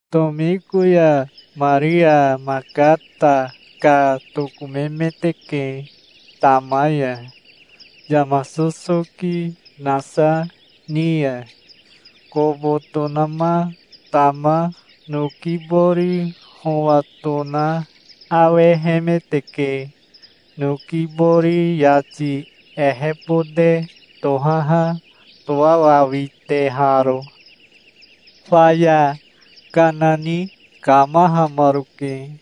Tomiko ya Maria Makata ka tokomemeteke tama ya, yama sosoki nasa ni ya. Kobo tonama tama noki bori howa tona awehemeteke, noki bori yati ehebote tohaha toawawiteharo. Faya kana ni kamahamaroke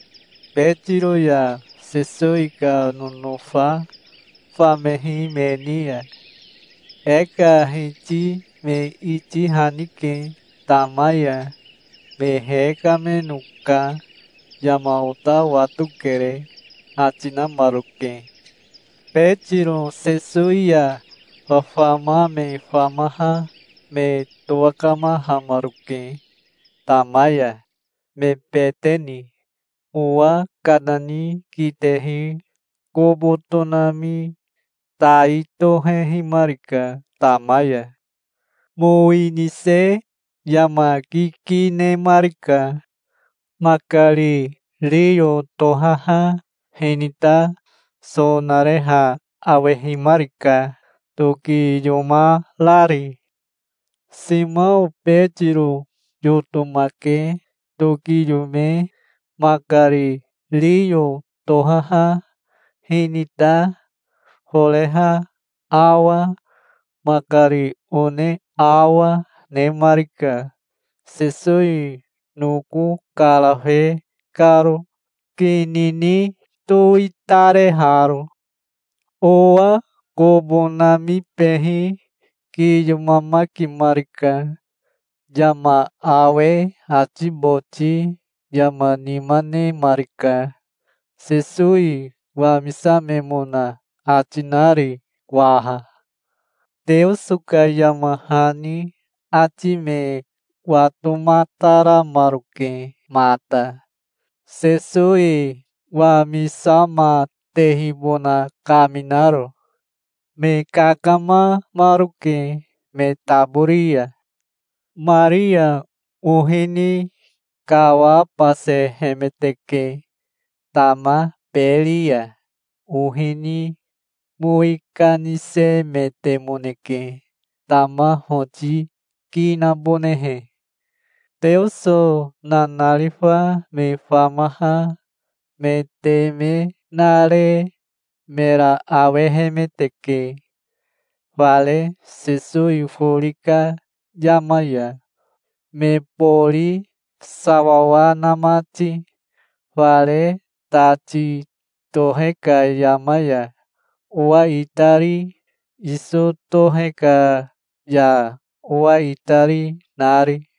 Betiro ya Sesowi ka nonofa famehi me ni ya. "E ka Hiti me itihanike tama ya. Me hekameno ka yama ota watokere", ati namaroke. Betiro Sesowi ya fafama me famaha me towakamahamaroke tama ya, me bete ni. Owa kana ni kitehi kobo tonami tai tohehimarika tama ya. Mowi nise yama kiki nemarika. Makari riyo tohaha hinita so nareha awehimarika, tokiyomarari. Simao Betiro yotomake tokiyome makari riyo tohaha hinita foreha awa, makari one awa, nemarika, Sesowi noko karafe karo, kini ni towitareharo. Owa kobo namibehi kiyomamakimarika. Yama awe ati boti yama nima nemarika, Sesowi wamisamemona ati nari waha. Teoso ka yama hani ati me watomataramaroke mata, Sesowi wamisamatehibona kaminaro. Me kakamamaroke me tabori ya. Maria ohi ni kawabasehemeteke tama beri ya. Ohi ni mowi kanisemetemoneke, tama hoti ki nabonehe. Teoso nanarifa me famaha me teme nare mera awehemeteke, fare Sesowi fori ka yama ya, me bori sawawa na mati, fare tati tohe ka yama ya owa itari, iso tohe ka ya owa itari, nari.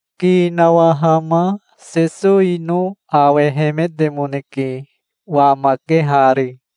Ki nawahama Sesowino awehemetemoneke, wamakehari.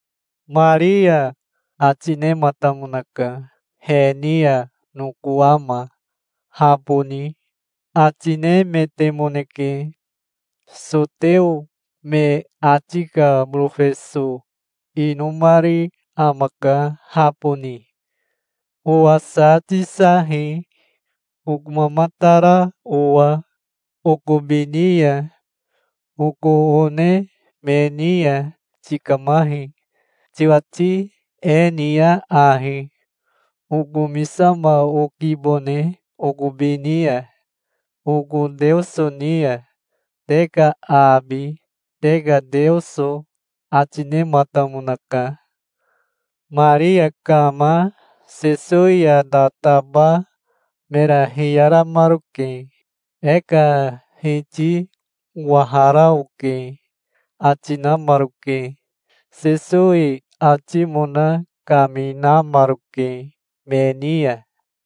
"Maria", ati nematamonaka. He ni ya nokowama "Haboni", ati nemetemoneke. Soteo me ati ka borofeso inomari amaka, haboni. "Owa sa tisahi, okomamatara owa okobi ni ya. Oko one me ni ya tikamahi. Tiwati e niya ahi: Okomisama okibone okobi ni ya, oko Teoso ni ya, te ka abi, te ka Teoso", ati nematamonaka. Maria kama Sesowi ya tataba mera hiyaramaroke. "E ka Hiti owahara oke", ati namaroke. Sesowi atimona kaminamaroke me ni ya.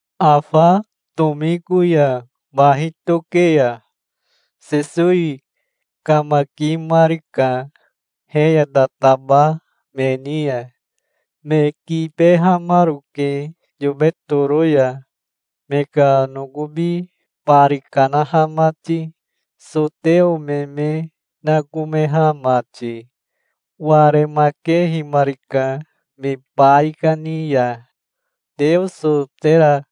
Afa tomiko ya bahi toke ya Sesowi kamakimarika he ya tataba me ni ya. Me kibehamaroke yobe toro ya, me ka nokobi bari kanaha mati, soteo me me nakomeha mati. Waremakehimarika me baikani ya. "Teoso tera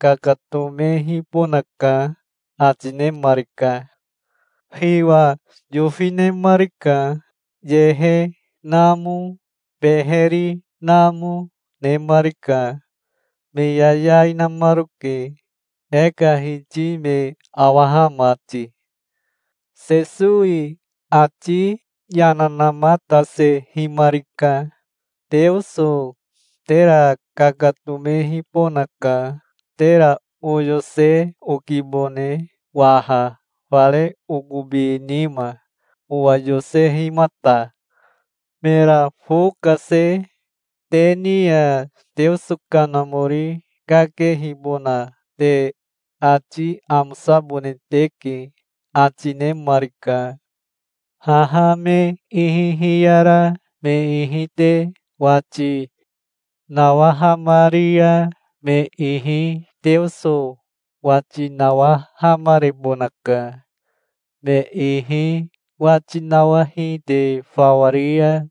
kakatomehibonaka", ati nemarika. Hiwa yofi nemarika. Yehe namo, beheri namo nemarika. Me yayai namaroke, e ka Hiti me awaha mati. Sesowi ati yana namatasehimarika. "Teoso tera kakatomehibonaka. Tera oyose okibone waha fare okobi nima, owa yosehimata". Mera fo kase "Te ni ya Teoso Kanamori kakehibona te ati amosabone teke", ati nemarika. "Haha me ihi hiyara me ihi te wati nawahamari ya me ihi Teoso wati nawahamarebonaka. Me ihi wati nawahi te fawa ri ya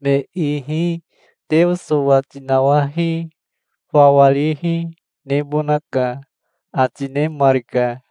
me ihi Teoso wati nawahi fawa rihi nebonaka", ati nemarika.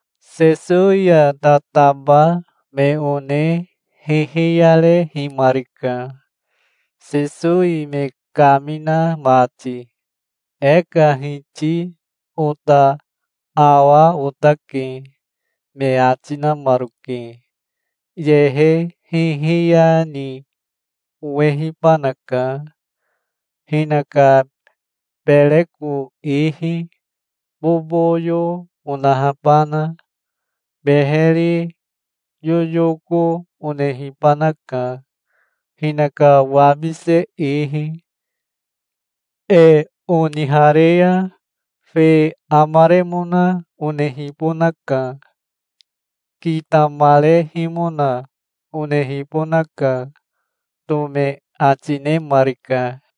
Sesowi ya tataba me one hihiyarehimarika, Sesowi me kamina mati. "E ka Hiti ota awa otake", me ati namaroke. "Yehe hihiya ni owehibanaka, hinaka bereko ihi boboyo onahabana. Beheri yoyoko onehibanaka, hinaka wabise ihi. E onihare ya fe amaremona onehibonaka. Kitamarehimona onehibonaka", Tome ati nemarika.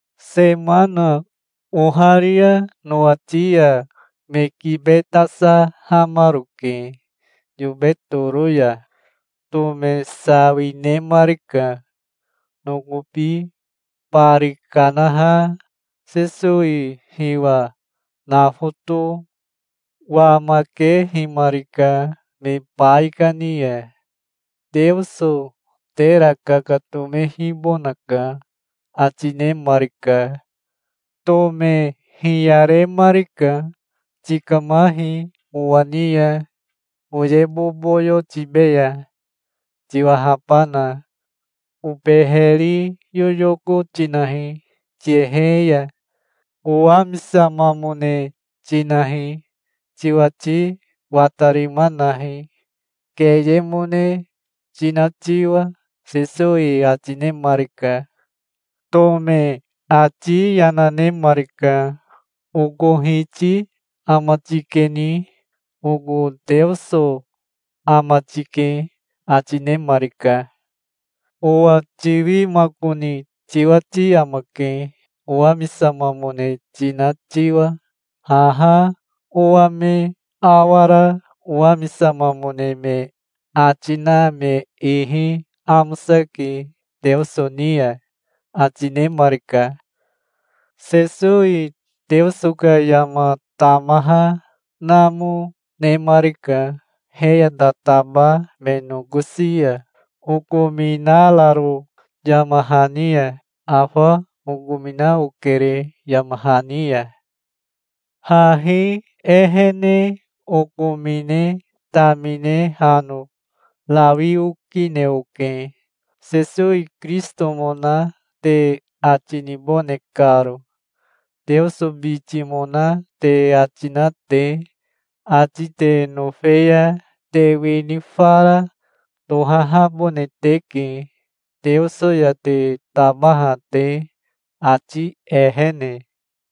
Semana oharia nowati ya me kibetasahamaroke yobe toro ya. Tome sawi nemarika. Nokobi bari kanaha Sesowi hiwa nafoto wamakehimarika me baikani ya. "Teoso tera kakatomehibonaka", ati nemarika. Tome hiyaremarika. "Tikamahi owa ni ya, oye boboyo tibeya, tiwahabana. Obeheri yoyoko tinahi tiyehe ya. Owamisamamone tinahi. Tiwati watarima nahi, keyemone tina tiwa", Sesowi ati nemarika. Tome ati yana nemarika. "Oko Hiti ama tikeni. Oko Teoso ama tike", ati nemarika. "Owa tiwimakoni tiwati amake, owamisamamone tina tiwa. Haha owa me awara owamisamamone me ati na me ihi amosake Teoso ni ya", ati nemarika. Sesowi Teoso ka yama tamaha namo nemarika he ya tataba me nokosi ya, okominararo yama hani ya. Afa okomina okere yama hani ya. Hahi ehene okomine tamine hano rawi okine oke, Sesowi Kirisitomona te ati nibone karo, Teoso bitimona te ati na te. Ati te nofe ya te wini fara tohahabone teke Teoso ya te tabaha te, ati ehene.